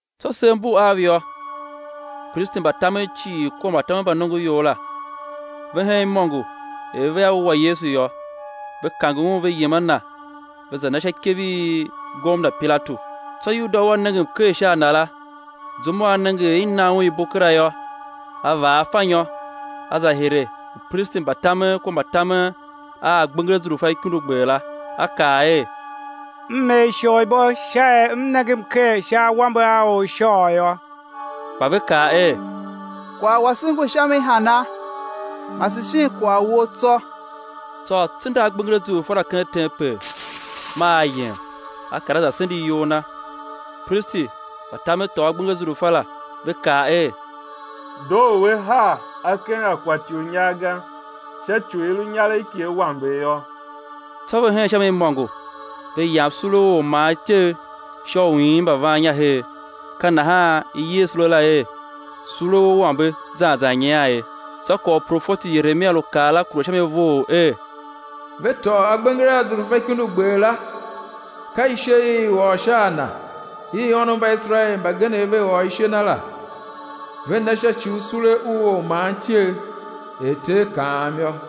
Tsô sev mbu av yô, upristi mba tamen cii kua mbatamen mba nongoior la, ve hen imôngo er vea wua Yesu yô. Ve kange Un ve yem a Na, ve za na sha ikev i gomna Pilatu. Tsô Yuda u a nenge mker sha a Na la, zum u a nenge er i na Un ibo kera yô, a vaa afanyô, a za hire upristi mba tamen kua mbatamen a agbenger azurfa ikundugber la, a kaa er: M er isholibo sha er m nenge mker sha awambe a or u ishôôgh yô. Kpa ve kaa er: Kwagh wase ngu sha mi hana? Mase shin kwagh wou tsô. Tsô a tsenda agbenger azurfa la ken tempel, maa a yem, a kar a za sende iyol na. Upristi mba tamen tôô agbenger azurfa la, ve kaa er: Doo u á haa a ken akwatinyar ga, sha ci u i lu inyaregh ki awambegh yô. Tsô ve hen sha mi imôngo, ve yam sule u ormaantyegh sha u iin mbavannya her. Ka nahan i yer sule la er, sule u awambe zan zan nyian ye. Tsô kwagh u profeti Yeremia lu kaa la kure sha mi vough er: Ve tôô agbenger azurfa ikundugber la, ka ishe i i ôr sha a na, i ônov mba Iserael mbagenev ve ôr ishe na la; ve na sha ci u sule u ormaantyegh, er Ter kaam yô.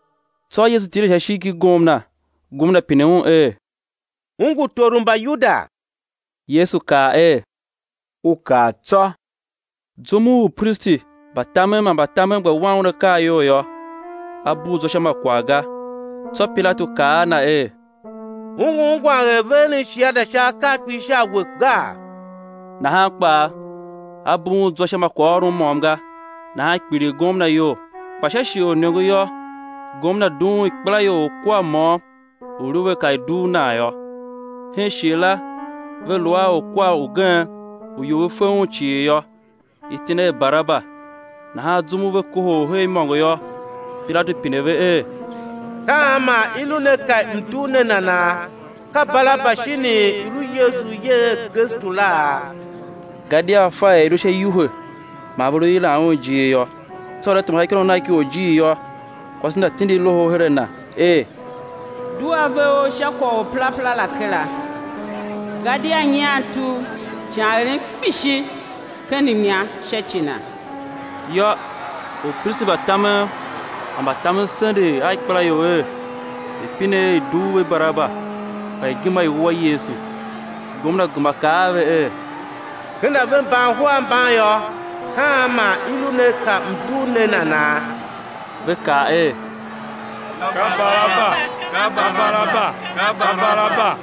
Tsô Yesu tile sha ishigh ki gomna. Gomna pine Un er: U ngu tor u Mbayuda? Yesu kaa er: U kaa tsô. Zum u upristi mba tamen man mbatamen gba wan Un akaa iyol yô, A bugh zwa sha ma kwagh ga. Tsô Pilatu kaa a Na er: U ngu ungwan er ve eren shiada sha akaa kpishi sha a we gaa? Nahan kpaa A bugh un zwa sha ma kwaghôron môm ga; nahan kpiligh gomna iyol. Kpa sha shighe u iniongo yô, gomna dughun ikpelaior orkwar môm u i lu ve ka i dugh nan yô. Hen shighe la ve lu a orkwar ugen u ior ve fe un cii yô, iti na er Baraba. Nahan zum u ve kohol her imôngo yô, Pilatu pine ve er: Ka an man i lu ne pe m̱ dugh ne nana? Ka Baraba shinii, i̱ lu Yesu u i yer er Kristu laa? Gadia a fa er i lu sha iwuhe man ve lu yilan Un ijir yô. Tsô er a tema sha ikônough nagh ki orjir yô, kwase na tindi loho her a na er: Dugh ave ou sha kwagh u Or u perapera la kera, gadia nyian tugh ican erem kpishi ken mnya sha ci Na. Yô, upristi mba tamen man mbatamen sendegh a ikpelaior er, ve̱ pine er i̱ dugh ve Baraba, kpa i̱ gema i̱ wua Yesu. Gomna gema kaa a ve er: Ken a ve mba uhar mban yô, ka an man i lu ne pe m̱ dugh ne nana? Ve kaa er: Ka Baraba!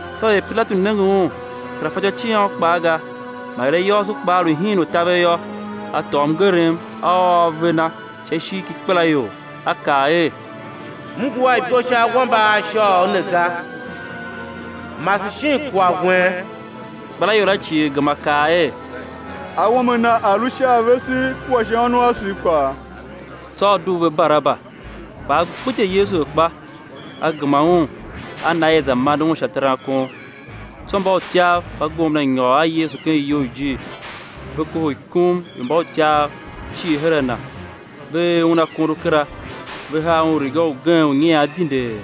Tsô er Pilatu nenge un kera fatyô ciôn kpaa ga, man er ayôôso kpaa lu hiin u taver yô, a tôô mngerem a ôô ave na sha ishigh ki ikpelaior, a kaa er: M ngu a ibo sha awambe a ishôôgh ne ga, mase shin kwagh wen. Ikpelaior la cii gema kaa er: Awambe a Na a̱ lu sha a vese kua sha ônov asev kpaa. Tsô a dugh ve Baraba, kpa a gbidye Yesu akpa, a gema Un a na er i̱ za mande Un sha terankon. Tsô mbautyav mba gomna nyôr a Yesu ken iyoujir, ve kohol ikum i mbautyav cii her a Na. Ve er Un akondo kera, ve haa Un riga ugen u nyian dindee;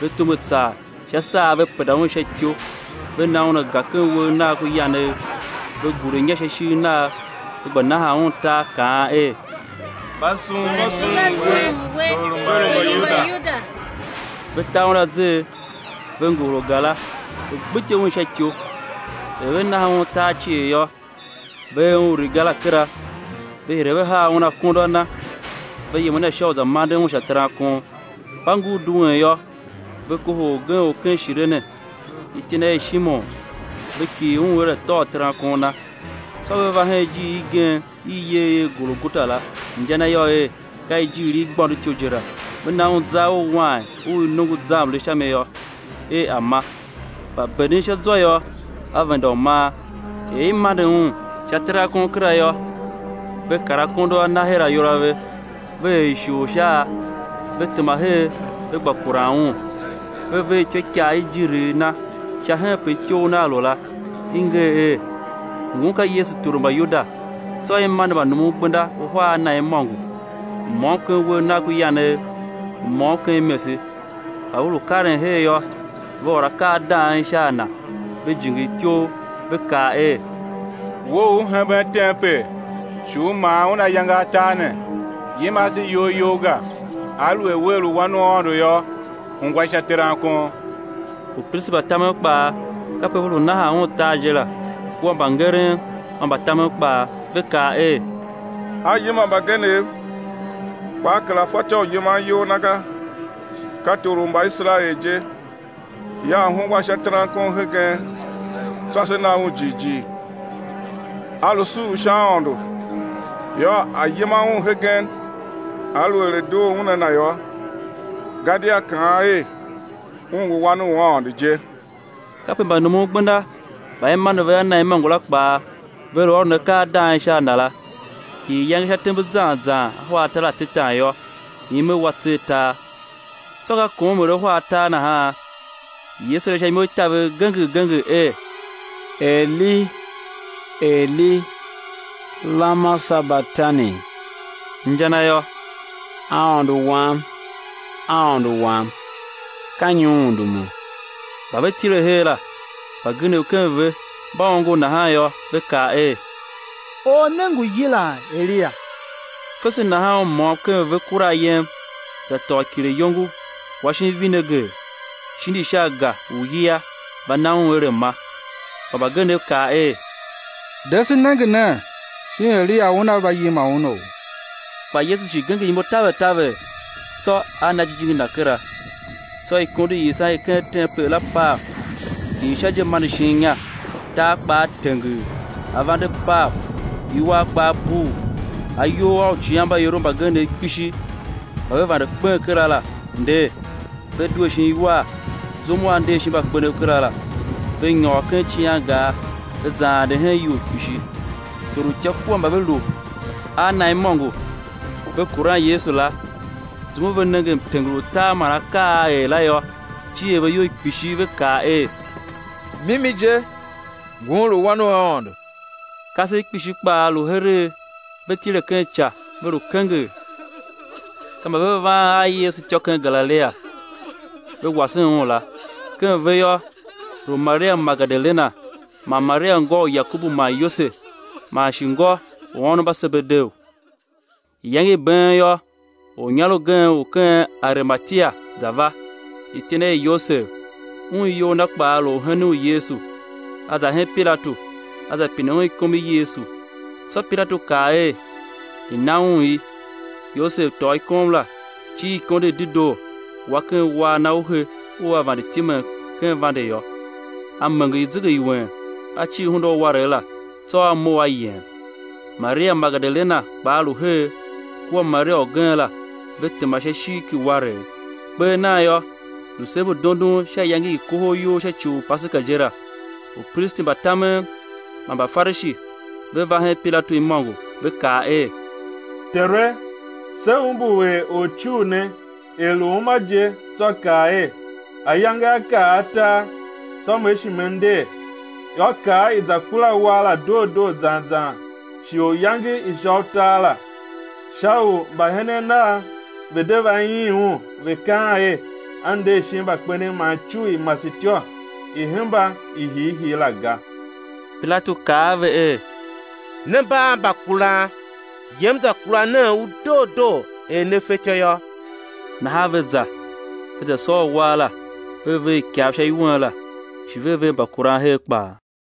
ve tume tsar sha saa ve penda Un sha ityou ve na Un aga ken uwegh Nagh ku yanegh, ve gure inya sha ishigh Nagh ve gba nahan Un tar, kaan er: Mba sughun We, tor u Mbayuda! Ve ta Un azer, ve ngohol aga la, ve gbidye Un sha ityou. Er ve nahan Un tar cii yô, ve er Un riga la kera, ve hire ve haa Un akondo a Na, ve yem a Na sha u za manden Un sha terankon. Mba ngur duen yô, ve kohol orgen u ken Shirene, iti na er Shimon; ve kighir un er a̱ tôô terankon Na. Tsô ve va hen ijiir igen i i yer er Golgota la, inja na yô er, ka ijiir i igbôndotyou je la, ve na Un zar u wain u i nongo zarmle sha mi yô, er A̱ ma; kpa benden sha zwa yô, A venda u man. Er i mande Un sha terankon kera yô, ve kar akondo a Na her ayol a ve, ve er ishor sha a. Ve tema her ve gba kuran Un. Ve ver ityôikaa i ijirigh Na sha henpe ityough Nagh lu la, i nger er: Ngun ka Yesu Tor u Mbayuda. Tsô i mande mbanumungbenda uhar a na imôngo, u môm ken uwegh Nagh ku yanegh, u môm ken imese. Mba ve lu karen her yô, ve ôr akaa a dang, sha a Na, ve jingir ityouv, ve kaa er: We u U hemben tempel, shi U maa un ayange atar ne, yima ase iyol You ga! Aluer wea lu Wan u Aôndo yô, hungwa sha terankon. Upristi mba tamen kpaa kape ve lu nahan Un tar je la kua mbangeren man mbatamen kpaa, ve kaa er: A yima mbagenev, kpa A kera fatyô u yiman iyol Na ga. Ka Tor u Mbaiserael je; yô, A̱ hungwa sha terankon hegen, tsô se na Un jighjigh. A lu suur sha Aôndo; yô, A̱ yima Un hegen, aluer a doo Un a Na yô, gadia kaan er, Un ngu Wan u Aôndo je. Kape mbanumungbenda mba i mande ve a Na imôngo la kpaa, ve lu ôron akaa a dang sha a Na la. Hii iyange sha tembe zan zan ahwa atar atetan yô, ime wa tser tar. Tsô ka kom er ahwa atar nahan, Yesu yila sha imo i taver genger genger er: Eli! Eli! Lama Sabatani! Inja na yô, Aôndo Wam, Aôndo Wam, ka nyi U undumu? Mba ve tile her la, mbagenev ken ve mba ongo nahan yô, ve kaa er: Or ne ngu yilan Eliya! Fese nahan u môm ken ve kura ayem, za tôô kileyongo, wa shin vineger, shindi sha aga u iyia va na Un er A̱ ma. Kpa mbagenev kaa er: De, se nenge nen shin Eliya una va yima Unou? Kpa Yesu shi genger imo taver taver, tsô A na jijingi Na kera. Tsô ikondo i yisan i ken tempel la pav, hii sha je mande shin inya. Tar kpaa tenger, avande pav; iwar kpaa bugh, ayol a uicighanmbaiorov mbagenev kpishi mba ve vande kpen kera la nder, ve due shin iwar zum u A nder shin mbakpenev kera la, ve nyôr ken icighangar, ve za ande hen ior kpishi. Torutya kua mba ve lu a na imôngo, ve kuran Yesu la, zum u ve nenge mtenger u tar man akaa a a er la yô, cier ve iyol kpishi ve kaa er: Mimi je, Ngun lu Wan u Aôndo. Kasev kpishi kpaa lu heregh, ve tile ken ica, ve lu kenger; ka mba ve van a Yesu jime ken Galilia, ve wasen Un la. Ken ve yô, lu Maria Magedalena, man Maria ngô u Yakobu man Yose, man shi ngô u ônov mba Sebedeu. Iyange i been yô, ornyar ugen u ken Arimatia, za va, iti na er Yosev; un iyol na kpaa lu orhenen u Yesu. A za hen Pilatu, a za pine ikom i Yesu. Tsô Pilatu kaa er, i̱ na un i. Yosev tôô ikom la, cir i ikondo i dedoo, wa ken uwar na u he u a vande timen ken vande yô; a menger zegeiwen, a cir hunda u uwaregh la, tsô a mough a yem. Maria Magedalena kpaa lu her, kua Maria ugen la, ve tema sha ishigh ki uwaregh. Kper nan yô, lu sev mbu dondon sha iyange i kohol iyol sha ci u Paseka je la, upristi mba tamen man Mbafarishi ve va hen Pilatu imôngo, Ve kaa er: Tere, se umbur er Orcugh ne, er lu uma je, tsô kaa er: Ayange á kar atar, tsô Me shi Me nder. Yô, kaa, i̱ za kura uwar la doo doo zan zan sha iyange i sha utar la, sha u mbahenen Nav ve̱ de va iin Un, ve̱ kaan er, A nder shin mbakpenev man icugh i masetyô i̱ hemba i hiihii la ga. Pilatu kaa a ve er: Ne mba a mbakuran, yem, za kura nen u doo doo er ne fatyô yô. Nahan ve za, ve za sôr uwar la, ve ver ikav sha iwen la, shi ve ver mbakuran her kpaa.